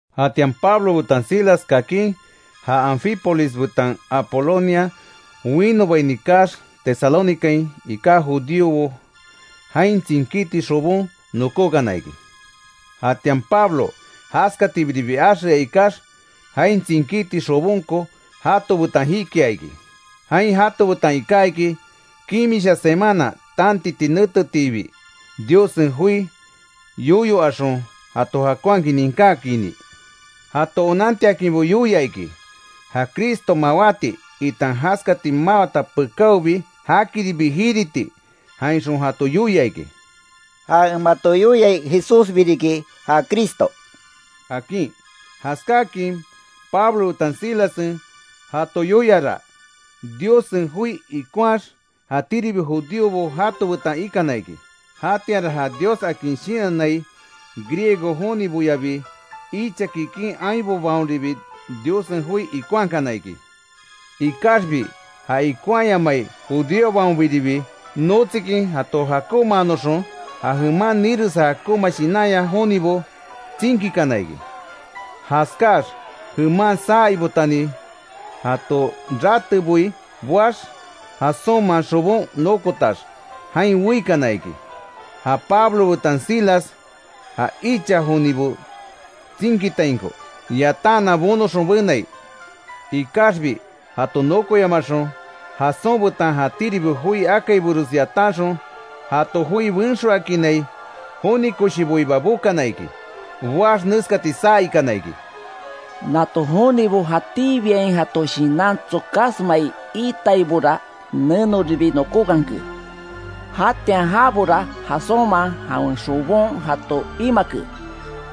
Jatian Pablo betan Silas kakin, ja Anfípolis betan Apolonia winobaini kaax, Tesalónicain iká judíobo jain tsinkíti xobon nokókana iki. Jatian Pablo jaskatibiribi axea ikax, jain tsinkíti xobonko jato betan jikia iki. Jain jato betan iká iki, kimisha semana tantiti netetiibi, Diossen joi yoyo axon jato jakonhakin ninkákiini. Jato onantiakinbo yoia iki; ja Cristo mawáti, itan jaskati mawata pekáobi, jakiribi jiriti. Jainxon jato yoia iki: —Ja en mato yoiai Jesúsbi riki ja Cristo —akin. Jaskáakin Pablo betan Silassen jato yoiara, Diossen joi ikonhaax, jatíribi judíobo jato betan ikana iki. Jatianra ja Dios akin shinannai Griego joniboyabi, icha kikin ainbobaonribi Diossen joi ikonhakana iki. Ikaxbi ja ikonhaayamai judíobaonbiribi, notsikin jato jakonmaanoxon ja jeman niresa jakonma shinanya jonibo tsinkikana iki. Jaskáax jeman saa ibotani jato rateboi boax, Jasónman xobon nokotax, jain weikana iki, ja Pablo betan Silas ja icha jonibo tsinkitainko yatanhanan bonoxon benai. Ikaxbi jato nokoyamaxon, Jasón betan jatíribi joi akaibores yatanxon, jato joi benxoakinai joni koshiboiba bokana iki. Boax, neskati saa ikana iki: —¡Nato jonibo, jatíbiain jato shinan tsokasmai iitaibora, nenoribi nokókanke. Jatian jabora Jasónman jawen xobon jato imake!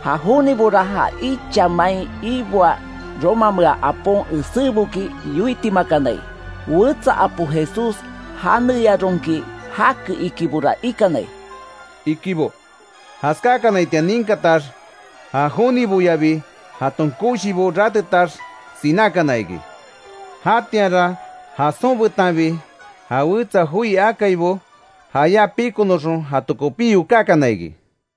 ¡Ja jonibora, ja icha mai iboaa romamea apon eséboki yoitimakanai. Wetsa apo Jesús janeyaronki jake ikibora ikanai! —ikibo. Jaskákanaitian ninkatax, ja joniboyabi jaton koshibo ratetax, sinákana iki. Jatianra Jasón betanbi ja wetsa joi akaibo, jayá pikonoxon jato kopí yokákana iki.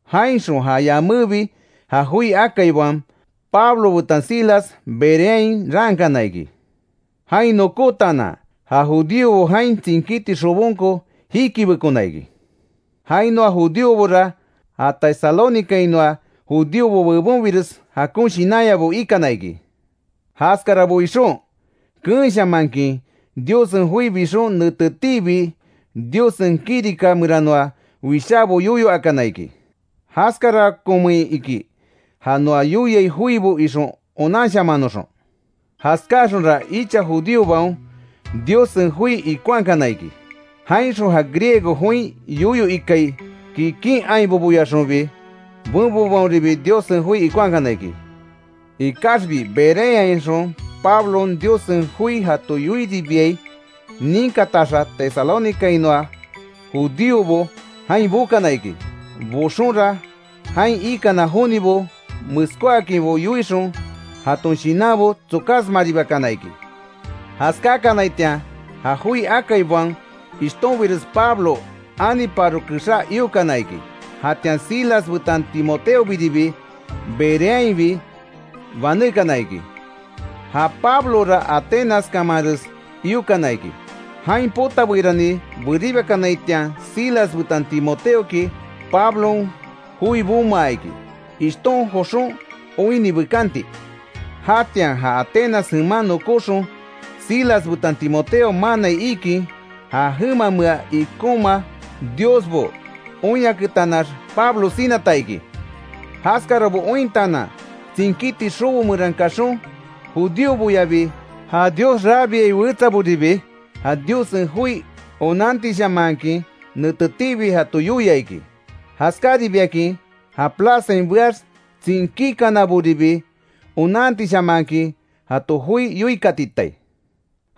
Jainxon ja yamébi ja joi akaibaon, Pablo betan Silas Bereain raankana iki. Jain nokótaanan, ja judíobo jain tsinkíti xobonko jikibekona iki. Jainoa judíobora, ja Tesalónicainoa judíobo bebonbires jakon shinanyabo ikana iki. Jaskarabo ixon, keenshamankin Diossen joi bixon, netetiibi Diossen kirika meranoa wishábo yoyo akana iki; Jaskarakonmein iki, ja noa yoiai joibo ixon onanshamannoxon. Jaskáaxonra icha judíobaon Diossen joi ikonhakana iki. Jainxon ja Griego join yoyo ikai kikin ainboboyaxonbi benbobaonribi Diossen joi ikonhakana iki. Ikaxbi Bereainxon Pablon, Diossen joi jato yoiribiai ninkataxa Tesalónicainoa judíobo jain bokana iki. Boxonra jain ikana jonibo meskóakinbo yoixon jaton shinanbo tsokásmaribakana iki. Jaskákanaitian, ja joi akaibaon ishtonbires Pablo aniparo kexá iokana iki. Jatian Silas betan Timoteobiribi Bereainbi banékana iki. Ja Pablora Atenas kamanres iokana iki, jain potabeirani beribakanaitian, Silas betan Timoteoki Pablon joi bomaa iki, ishton joxon oinni bekanti. Jatian ja Atenas jeman nokóxon, Silas betan Timoteo manaai iikin, ja jemamea ikonma diosbo oinyaketanax, Pablo sinata iki. Jaskarabo ointaanan, tsinkíti xobo meran kaxon, judíoboyabi ja Dios rabiai wetsaboribi, ja Diossen joi onantishamanhakin netetiibi jato yoia iki. Jaskáribiakin ja plazain beax tsinkíkanaboribi, onantishamanhakin jato joi yoikatitai.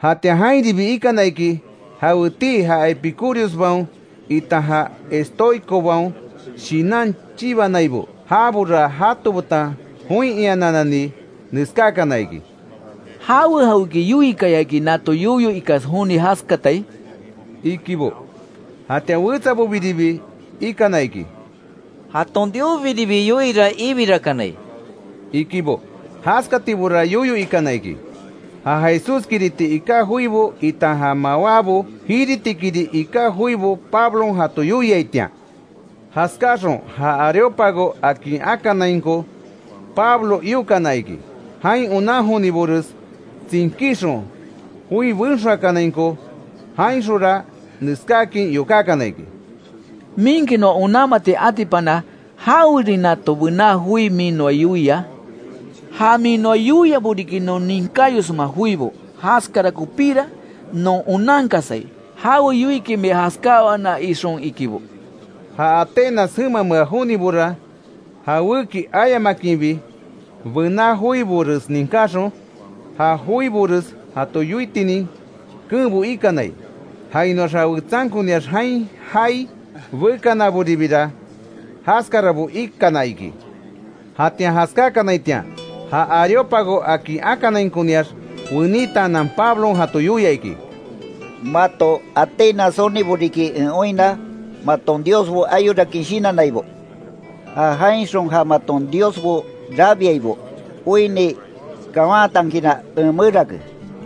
Jatian jainribi ikana iki, jawetii ja Epicúriosbaon itan ja Estoicobaon shinan chibanaibo, jabora jato betan join iananani neskákana iki: —¿Jawe jawéki yoiikayaki, nato yoyo ikas joni jaskatai? —ikibo. Jatian wetsabobiribi ikana iki: —Jaton diosbiribi yoiira ibirakanai —ikibo. Jaskatibora yoyo ikana iki, ja Jesúskiriti iká joibo itan ja mawábo jiritikiri iká joibo Pablon jato yoiaitian. Jaskáxon, ja Areópago akin akanainko Pablo iokana iki, jain onan jonibores tsinkíxon joi benxoakanainko. Jainxonra neskáakin yokákana iki: —¿Minki noa onanmati atipana, jawerin nato bená joi min noa yoia? Ja min noa yoiabo riki, non ninkáyosma joibo. Jaskara kopíra non onankasai, jawe yoiiki mia jaskáwana ixon —ikibo. Ja Atenas jemamea jonibora jawéki ayamakinbi, bená joibores ninkáxon, ja joibores jato yoitinin keenbo ikanai, jainoax ja wetsankoniax jain jaai bekanaboribira jaskarabo ikana iki. Jatian jaskákanaitian, ja Areópago akin akanainkoniax weítaanan Pablon jato yoia iki: “Mato Atenas jonibo riki en oinna, maton diosbo ayorakin shinannaibo. Ja jainxon ja maton diosbo rabiaibo oinni kawantankinra, en merake,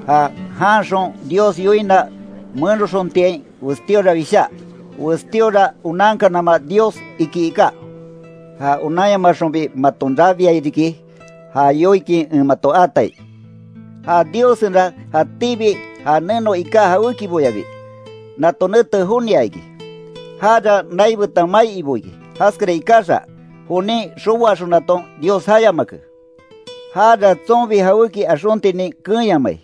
ja jaanxon Dios yoina menoxontiain, westíora wishá: ‘Westíora onankanama dios’, iki iká. Ja onanyamaxonbi maton rabiai riki, já yoikin en mato aatai. Ja Diossenra jatíbi ja neno iká jawékiboyabi, nato nete jonia iki. Jara nai betan mai ibo iki, jaskara ikaxa, jonin xoboaxonaton Dios jayamake. Jara tsonbi jawéki axontinin keenyamai,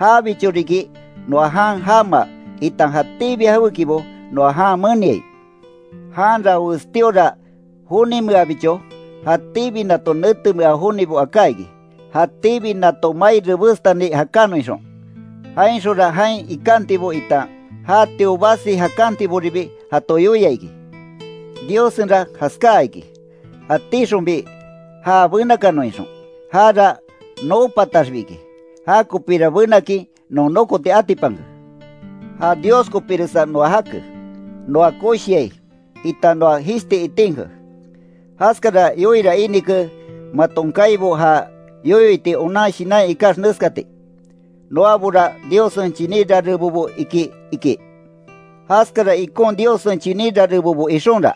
jabicho riki noa jan jamaa itan jatíbi jawékibo noa jan meniai. Janra westíora jonimeabicho, jatíbi nato netemea jonibo aká iki, jatíbi nato mai rebestani jakanon ixon. Jainxonra jain ikantibo itan jatio basi jakantiboribi jato yoia iki. Diossenra jaskaa iki, jatíxonbi já benakanon ixon, jara noo pataxbi iki. Jakopira benakin non nokoti atipanke. Ja Dios kopíresa noa jake, noa koshiai, itan noa jishti itinke. Jaskara yoiira inike maton kaibo ja yoyo iti onan shinanya ikax neskati: ‘Noabora Diossen chiní rarebobo iki’, iki. Jaskara ikon Diossen chiní rarebobo ixonra,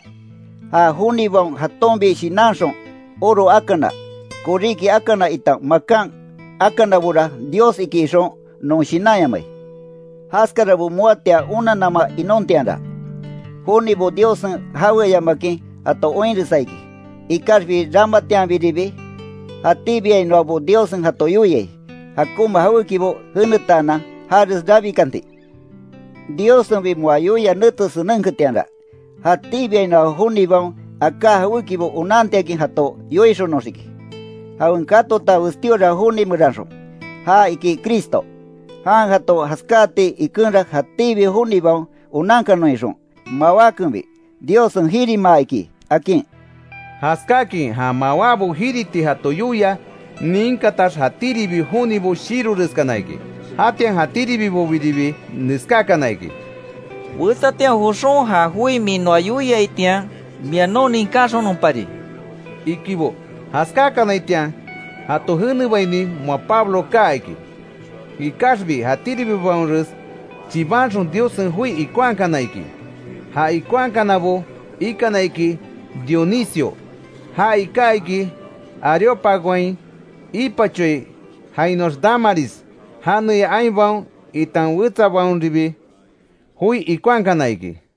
ja jonibaon jatonbi shinanxon oro akana, koríki akana itan makan akanabora dios iki ixon non shinanyamai. Jaskarabo moatian onanama inontianra, jonibo Diossen jaweayamakin jato oinresa iki. Ikaxbi ramatianbiribi jatíbiainoabo Diossen jato yoiai, jakonma jawékibo jenetaanan jares rabikanti. Diossenbi moa yoia nete senenketianra, jatíbiainoa jonibaon aka jawékibo onantiakin jato yoixonoxiki, jawen katota westíora joni meranxon, ja iki Cristo. Jan jato jaskáati ikenra jatíbi jonibaon onankanon ixon, mawákenbi Diossen jirimaa iki”, akin. Jaskáakin ja mawábo jiriti jato yoia ninkatax, jatíribi jonibo shiroreskana iki. Jatian jatíribibobiribi neskákana iki: —Wetsatian joxon ja joi min noa yoiaitian mia non ninkáxononpari —ikibo. Jaskákanaitian jato jenebaini moa Pablo kaa iki. Ikaxbi jatíribibaonres chibanxon, Diossen joi ikonhakana iki, ja ikonhakanabo ikana iki; Dionisio, ja iká iki, Areópagoain ipachoai. Jainoax Dámaris janeya ainbaon itan wetsabaonribi joi ikonhakana iki.